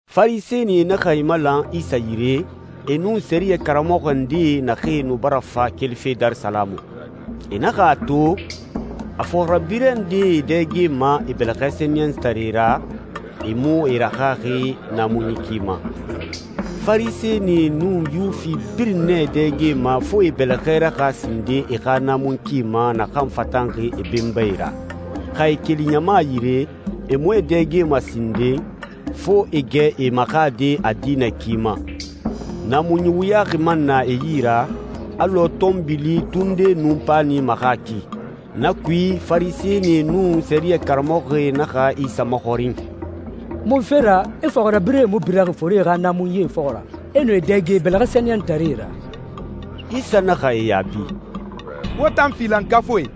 Farisɛnie naxa e malan Isa yire, e nun sɛriyɛ karamɔxɔ ndee naxee nu bara fa kelife Darisalamu. E naxa a to, a fɔxirabirɛ ndee e dɛgema e bɛlɛxɛ sɛniyɛntaree ra, e mu e raxaxi naamunyi ki ma. Farisɛnie nun Yuwifi birin nɛ e dɛgema fo e e bɛlɛxɛ raxa sinden e xa naamunyi ki ma naxan fatanxi e benbae ra. Xa e keli ɲama yire, e mu e dɛgema sinden, fo e gɛ e maxade a diinɛ ki ma. Naamunyi wuyaxi man na e yi ra, alɔ tɔnbili, tunde, nun paani maxa ki. Na kui, Farisɛnie nun sɛriyɛ karamɔxɔe naxa Isa maxɔrin, «Munfe ra i fɔxirabirɛe mu biraxi forie xa naamunyie fɔxɔ ra, e nu e dɛge e bɛlɛxɛ sɛniyɛntaree ra?» Isa naxa e yaabi, «Wo tan filankafuie,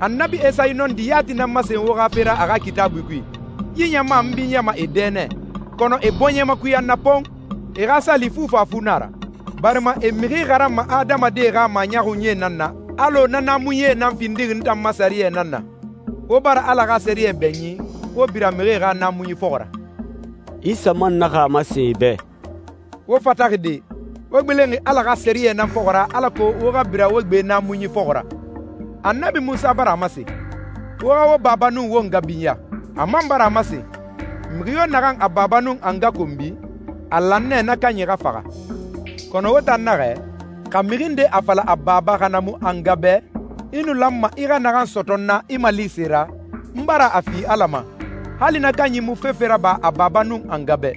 Annabi Esayi nɔndi yati nan masen wo xa fe ra a xa Kitaabui kui, ‹Yi ɲama n binyama e dɛ nɛ, kɔnɔ e bɔɲɛ makuya n na pon! E xa sali fufafu na a ra, barima e mixi xaranma adamadie xa maɲɔxunyie nan na alɔ na naamunyie nan findixi n tan ma sɛriyɛ nan na.›» «Wo bara Ala xa sɛriyɛ bɛɲin, wo bira mixie xa naamunyi fɔxɔ ra.» Isa man naxa a masen e bɛ, «Wo fataxi de! Wo gbilenxi Ala xa sɛriyɛ nan fɔxɔ ra alako wo xa bira wo gbe naamunyi fɔxɔ ra! Annabi Munsa bara a masen, ‹Wo xa wo baba nun wo nga binya.› A man bara a masen, ‹Mixi yo naxan a baba nun a nga konbi, a lan nɛ na kanyi xa faxa.› Kɔnɔ wo tan naxɛ, xa mixi nde a fala a baba xa na mu a nga bɛ, ‹I nu lanma i xa naxan sɔtɔ n na i malise ra, n bara a fi Ala ma,› hali na kanyi mu fefe raba a baba nun a nga bɛ.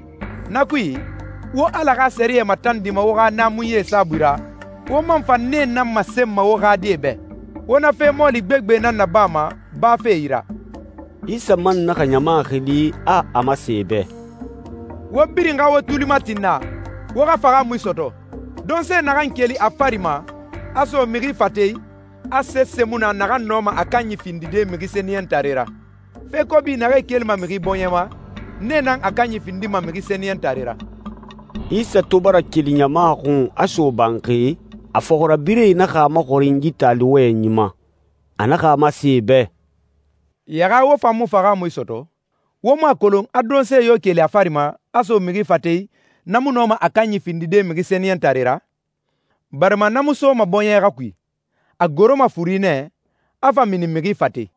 Na kui, wo Ala xa sɛriyɛ matandima wo xa naamunyie saabui ra, wo man fa nee nan masenma wo xa die bɛ. Wo na fe mɔɔli gbegbe nan nabama, bafe yi ra.» Isa man naxa ɲama xili, a a masen e bɛ, «Wo birin xa wo tuli mati n na, wo xa fahaamui sɔtɔ. Donse naxan keli a fari ma, a so mixi fate i, a sese mu na naxan nɔma a kanyi findide mixi sɛniyɛntare ra. Fe kobi naxee kelima mixi bɔɲɛ ma, nee nan a kanyi findima mixi sɛniyɛntare ra.» Isa to bara keli ɲama xun, a so banxi, a fɔxirabirɛe naxa a maxɔrin yi taali wɔyɛnyi ma. A naxa a masen e bɛ, «Yaxa wo fan mu fahaamui sɔtɔ? Wo mu a kolon, a donse yo keli a fari ma, a so mixi fate i, na mu nɔma a kanyi findide mixi sɛniyɛntare ra? Barima na mu soma bɔɲɛ xa kui, a goroma furi nɛ, a fa mini mixi fate i.»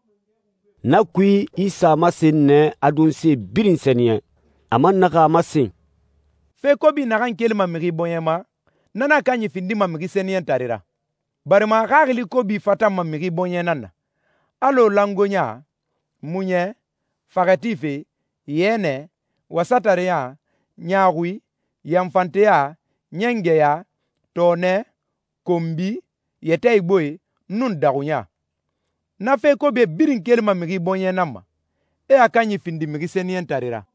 Na kui, Isa a masen nɛ, a donse birin sɛniyɛn. A man naxa a masen, «Fe kobi naxan kelima mixi bɔɲɛ ma, na nan a kanyi findima mixi sɛniyɛntare ra. Barima xaxili kobi fatanma mixi bɔɲɛ nan na, alɔ langoeɲa, muɲɛ, faxɛ tife, yɛnɛ, wasatareya, ɲaaxui, yanfanteya, ɲɛngɛya, tɔɔnɛ, konbi, yɛtɛ igboe, nun daxuɲa. Na fe kobie birin kelima mixi bɔɲɛ nan ma, e a kanyi findi mixi sɛniyɛntare ra.»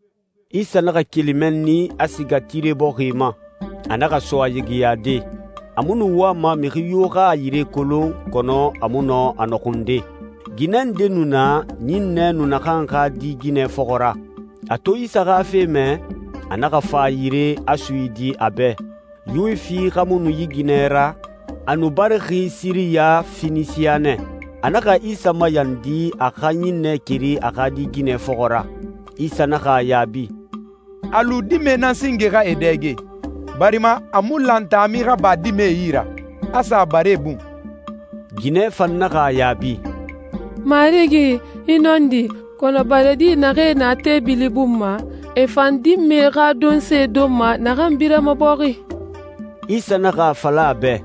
Isa naxa keli mɛnni, a siga Tire bɔxi ma. A naxa so a yigiyade. A mu nu wama mixi yo xa a yire kolon, kɔnɔ a mu nɔ a nɔxunde. Ginɛ nde nu na, ɲinnɛ nu naxan xa di ginɛ fɔxɔ ra. A to Isa xa fe mɛ, a naxa fa a yire, a suyidi a bɛ. Yuwifi xa mu nu yi ginɛ ra, a nu barixi Siriya Fenisiya nɛ. A naxa Isa mayandi, a xa ɲinnɛ keri a xa di ginɛ fɔxɔ ra. Isa naxa a yaabi, «A lu dimɛe nan singe xa e dɛge, barima a mu lan taami xa ba dimɛdie yi ra, a sa baree bun.» Ginɛ fan naxa a yaabi, «Marigi, i nɔndi, kɔnɔ baredi naxee na teebili bun ma, e fan dimɛe xa donse donma naxan birama bɔxi.» Isa naxa a fala a bɛ,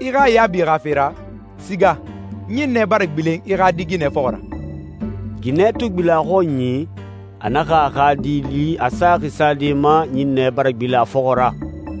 «I xa yaabi xa fe ra, siga, ɲinnɛ bara gbilen i xa di ginɛ fɔxɔ ra.» Ginɛ to gbilen a xɔnyi, a naxa a xa di li a saxi sade ma, ɲinnɛ bara gbilen a fɔxɔ ra.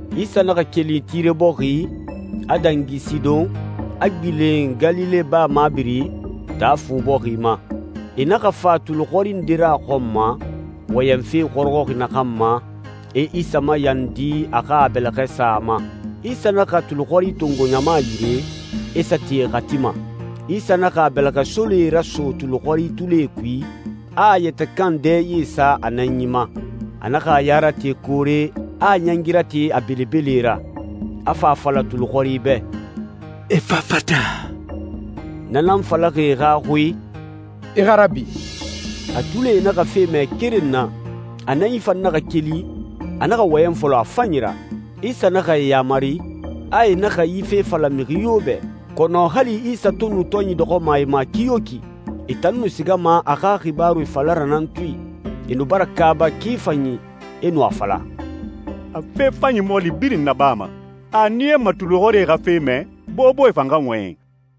Isa naxa keli Tire bɔxi, a dangi Sidɔn, a gbilen Galile baa mabiri, Taa Fu bɔxi ma. E naxa fa tulixɔri nde ra a xɔn ma, wɔyɛnfe xɔrɔxɔxi naxan ma, e Isa mayandi a xa a bɛlɛxɛ sa a ma. Isa naxa tulixɔri tongo ɲama yire, e sa ti e xati ma. Isa naxa a bɛlɛxɛsolee raso tulixɔri tulie kui, a a yɛtɛ kan dɛye sa a nɛnyi ma. A naxa a ya rate koore, a a ɲɛngi rate a belebele ra. A fa a fala tulixɔri bɛ, «Efafata!» Na nan falaxi e xa xui, «I xa rabi!» A tulie naxa fe mɛ keren na, a nɛnyi fan naxa keli, a naxa wɔyɛn fɔlɔ a fanyi ra. Isa naxa e yamari, a e naxa yi fe fala mixi yo bɛ. Kɔnɔ hali Isa to nu tɔnyi dɔxɔma e ma kiyoki, e tan nu sigama a xa xibaaru fala ra nan tui. E nu bara kaaba ki fanyi, e nu a fala, «A fe fanyi mɔɔli birin nabama! A a niyama tulixɔri xa fe mɛ, boboe fan xa wɔyɛn!»